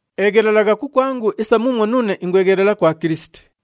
Eghelelagha kukwangu isa muumwo nuune ingweghelela kwa Kilisiti.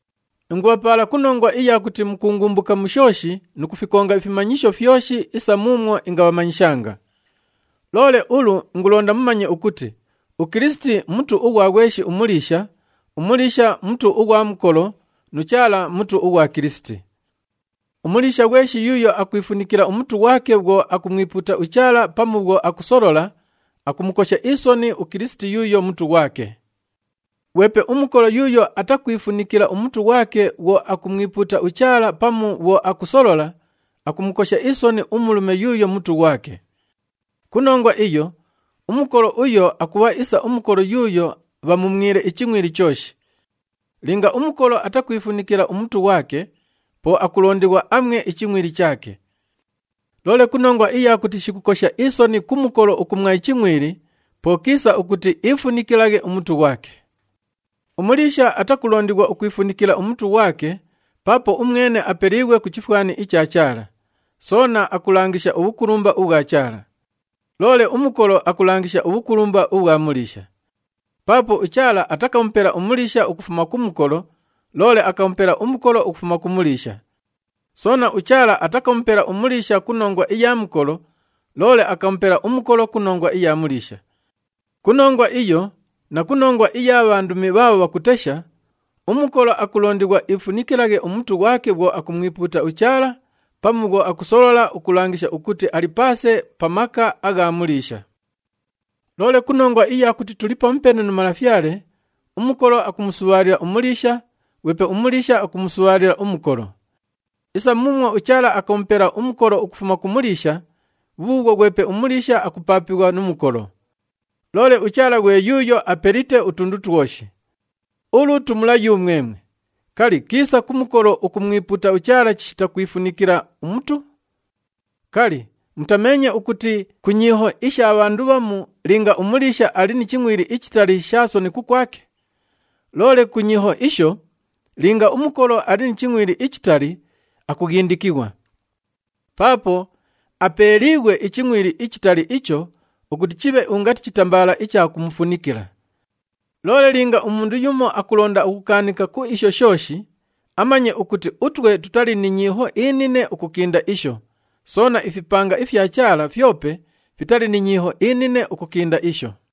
Ingubhapaala ku nongwa iya kuti mukuungumbuka mu shooshi nu kufikonga ifimanyisho fyoshi isa muumwo ingabhamanyishanga. Loole ulu ingulonda mumanye ukuti uKilisiti mutu ughwa ghweshi umuliisha, umuliisha mutu ughwa mukolo nu Chaala mutu ughwa Kilisiti. Umuliisha ghweshi yuuyo akwifunikila umutu ghwake bhwo akumwipuuta uChaala pamu bhwo akusolola, akumukosha isoni uKilisiti yuuyo mutu ghwake. Ghwepe umukolo yuuyo atakwifunikila umutu ghwake bhwo akumwipuuta uChaala pamu bhwo akusolola, akumukosha isoni umulume yuuyo mutu ghwake. Ku nongwa iyo, umukolo uyo akubha isa umukolo yuuyo bhamumwile ichingʼwili chooshi. Linga umukolo atakwifunikila umutu ghwake, po akulondighwa amwe ichingʼwili chaake! Loole ku nongwa iya kuti shikukosha isoni ku mukolo ukumwa ichingʼwili, po kiisa ukuti iifunikilaghe umutu ghwake. Umuliisha atakulondighwa ukwifunikila umutu ghwake, paapo umwene apeliighwe ku chifwani icha Chaala, soona akulangisha ubhukulumba ubhwa Chaala. Loole umukolo akulangisha ubhukulumba ubhwa muliisha. Paapo uChaala atakamupela umuliisha ukufuma ku mukolo, loole akamupela umukolo ukufuma ku muliisha. Soona, uChaala atakamupela umuliisha ku nongwa iya mukolo, loole akamupela umukolo ku nongwa iya muliisha. Ku nongwa iyo na ku nongwa iya bhandumi bhaabho bhakutesha, umukolo akulondighwa iifunikilaghe umutu ghwake bhwo akumwipuuta uChaala pamu bhwo akusolola ukulangisha ukuti ali paase pa maka agha muliisha. Loole ku nongwa iya kuti tuli pamupeene nu Malafyale, umukolo akumusubhaalila umuliisha, ghwepe umuliisha akumusubhaalila umukolo. Isa muumwo uChaala akamupela umukolo ukufuma ku muliisha, bhubhuubhwo ghwepe umuliisha akupaapighwa nu mukolo. Loole uChaala ghwe yuuyo apelite utundu twoshi. Ulu tumula yumwemwe, kali, kiisa ku mukolo ukumwipuuta uChaala chishita kwifunikila umutu? Kali, mutameenye ukuti ku nyiiho isha bhandu bhamu linga umuliisha ali ni chingʼwili ichitali sha soni kukwake? Loole ku nyiiho isho, linga umukolo ali ni chingʼwili ichitali, akughindikighwa. Paapo apeeliighwe ichingʼwili ichitali icho ukuti chibhe ungati chitambaala icha kumufunikila. Loole linga umundu yumo akulonda ukukaanika ku isho shooshi, amanye ukuti utwe tutali ni nyiiho inine ukukinda isho, soona ifipanga ifya Chaala fyope fitali ni nyiiho inine ukukinda isho.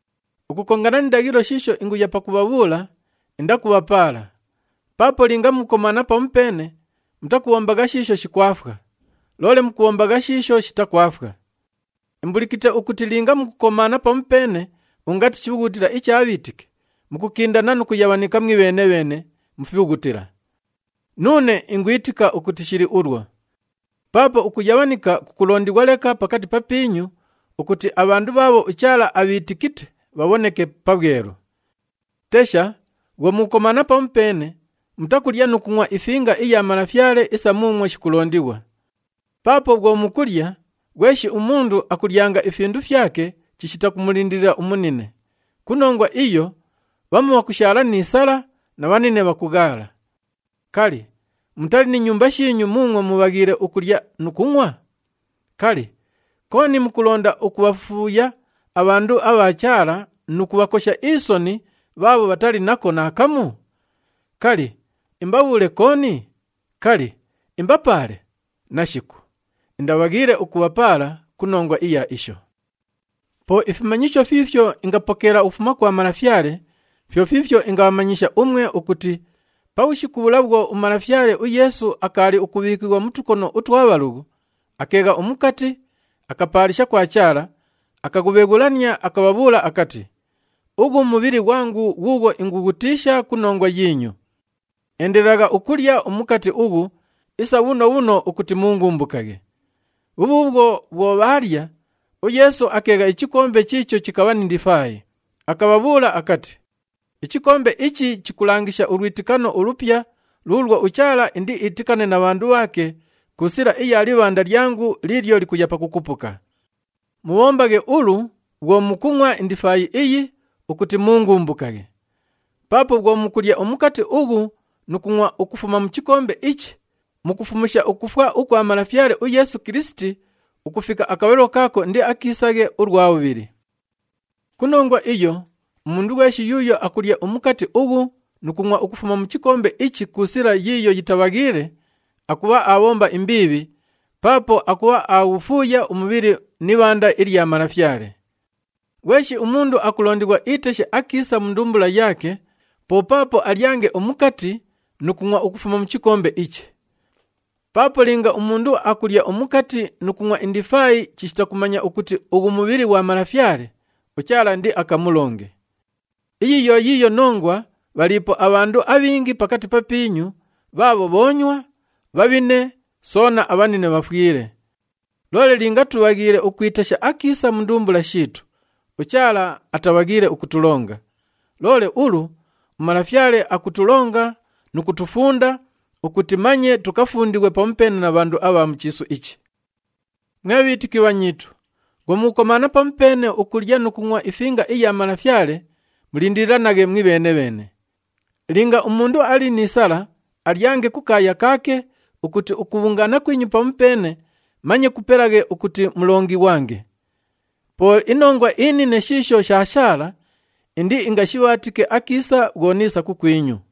Ukukongana ni ndaghilo shiisho inguya pakubhabhuula, indakubhapaala. Paapo linga mukukomaana pamupeene, mutakubhombagha shiisho shikwafwa, loole mukubhombagha shiisho shitakwafwa. Imbulikite ukuti linga mukukomaana pamupeene ungati chibhughutila icha bhiitiki, mukukindana nu kuyabhanika mwibheene-bheene mu fibhughutila. Nuune ingwitika ukuti shili ulwo. Paapo ukuyabhanika kukulondighwa leka pakati papiinyu ukuti abhandu bhaabho uChaala abhiitikite bhabhoneke pabhwelu. Tesha, bhwo mukukomaana pamupeene, mutakulya nu kungʼwa iFinga iya Malafyale isa muumwo shikulondighwa. Paapo bhwo mukulya, ghweshi umundu akulyanga ifindu fyake chishita kumulindilila umunine. Ku nongwa iyo, bhamu bhakushaala ni sala na bhanine bhakughaala. Kali, mutali ni nyumba shiinyu muumwo mubhaghiile ukulya nu kungʼwa? Kali, kooni mukulonda ukubhafuuya abhandu abha Chaala nu kubhakosha isoni bhaabho bhatali nako naakamu? Kali, imbabhuule kooni? Kali, imbapaale? Nashiku! Indabhaghiile ukubhapaala ku nongwa iya isho. Po ifimanyisho fiifyo ingapokeela ukufuma kwa Malafyale, fyo fiifyo ingabhamanyisha umwe ukuti pabhushiku bhula bhwo uMalafyale uYeesu akaali ukubhiikighwa mu tukono utwa bhalughu, akeegha umukati, akapaalisha kwa Chaala, akaghubheghulania, akabhabhuula akati, “Ughu mubhili ghwangu ghuughwo ingughutiisha ku nongwa yiinyu. Endelelagha ukulya umukati ughu isa bhuno bhuno ukuti muungumbukaghe.” Bhubhuubhwo, bhwo bhaalya, uYeesu akeegha ichikombe chiicho chikabha ni ndifaayi, akabhabhuula akati, “Ichikombe ichi chikulangisha ulwitikano ulupya luulwo uChaala indiitikane na bhandu bhaake ku sila iya libhanda lyangu liilyo likuya pakukupuka. Mubhombaghe ulu bhwo mukungʼwa indifaayi iyi ukuti muungumbukaghe.” Paapo bhwo mukulya umukati ughu nu kungʼwa ukufuma mu chikombe ichi, mukufumusha ukufwa ukwa Malafyale uYeesu Kilisiti ukufika akabhalilo kaako indiakiisaghe ulwa bhubhili. Ku nongwa iyo, umundu ghweshi yuuyo akulya umukati ughu nu kungʼwa ukufuma mu chikombe ichi ku sila yiiyo yitabhaghiile, akubha aabhomba imbiibhi paapo akubha aghufuuya umubhili ni ibhanda ilya Malafyale. Ghweshi umundu akulondighwa iiteshe akiisa mu ndumbula yaake, po paapo alyange umukati nu kungʼwa ukufuma mu chikombe ichi. Paapo linga umundu akulya umukati nu kungʼwa indifaayi chishita kumanya ukuti ughu mubhili ghwa Malafyale, uChaala indiakamulonge. Iyi yo yiiyo nongwa bhaliipo abhandu abhingi pakati papiinyu bhaabho bhoonywa, bhabhine soona abhanine bhafwile. Loole linga tubhaghiile ukwitesha akiisa mu ndumbula shiitu, uChaala atabhaghiile ukutulonga. Loole ulu uMalafyale akutulonga nu kutufunda ukuti manye tukafundighwe pamupeene na bhandu abha mu chiisu ichi. Mwe bhiitiki bhanyiitu, bhwo mukukomaana pamupeene ukulya nu kungʼwa iFinga iya Malafyale, mulindililanaghe mwibheene-bheene. Linga umundu ali ni sala, alyange kukaaya kaake ukuti ukubhungaana kwinyu pamupeene manye kupelaghe ukuti mulongighwange. Po inongwa inine shiisho shaashaala, indiingashibhaatike akiisa bhwo niisa kukwinyu.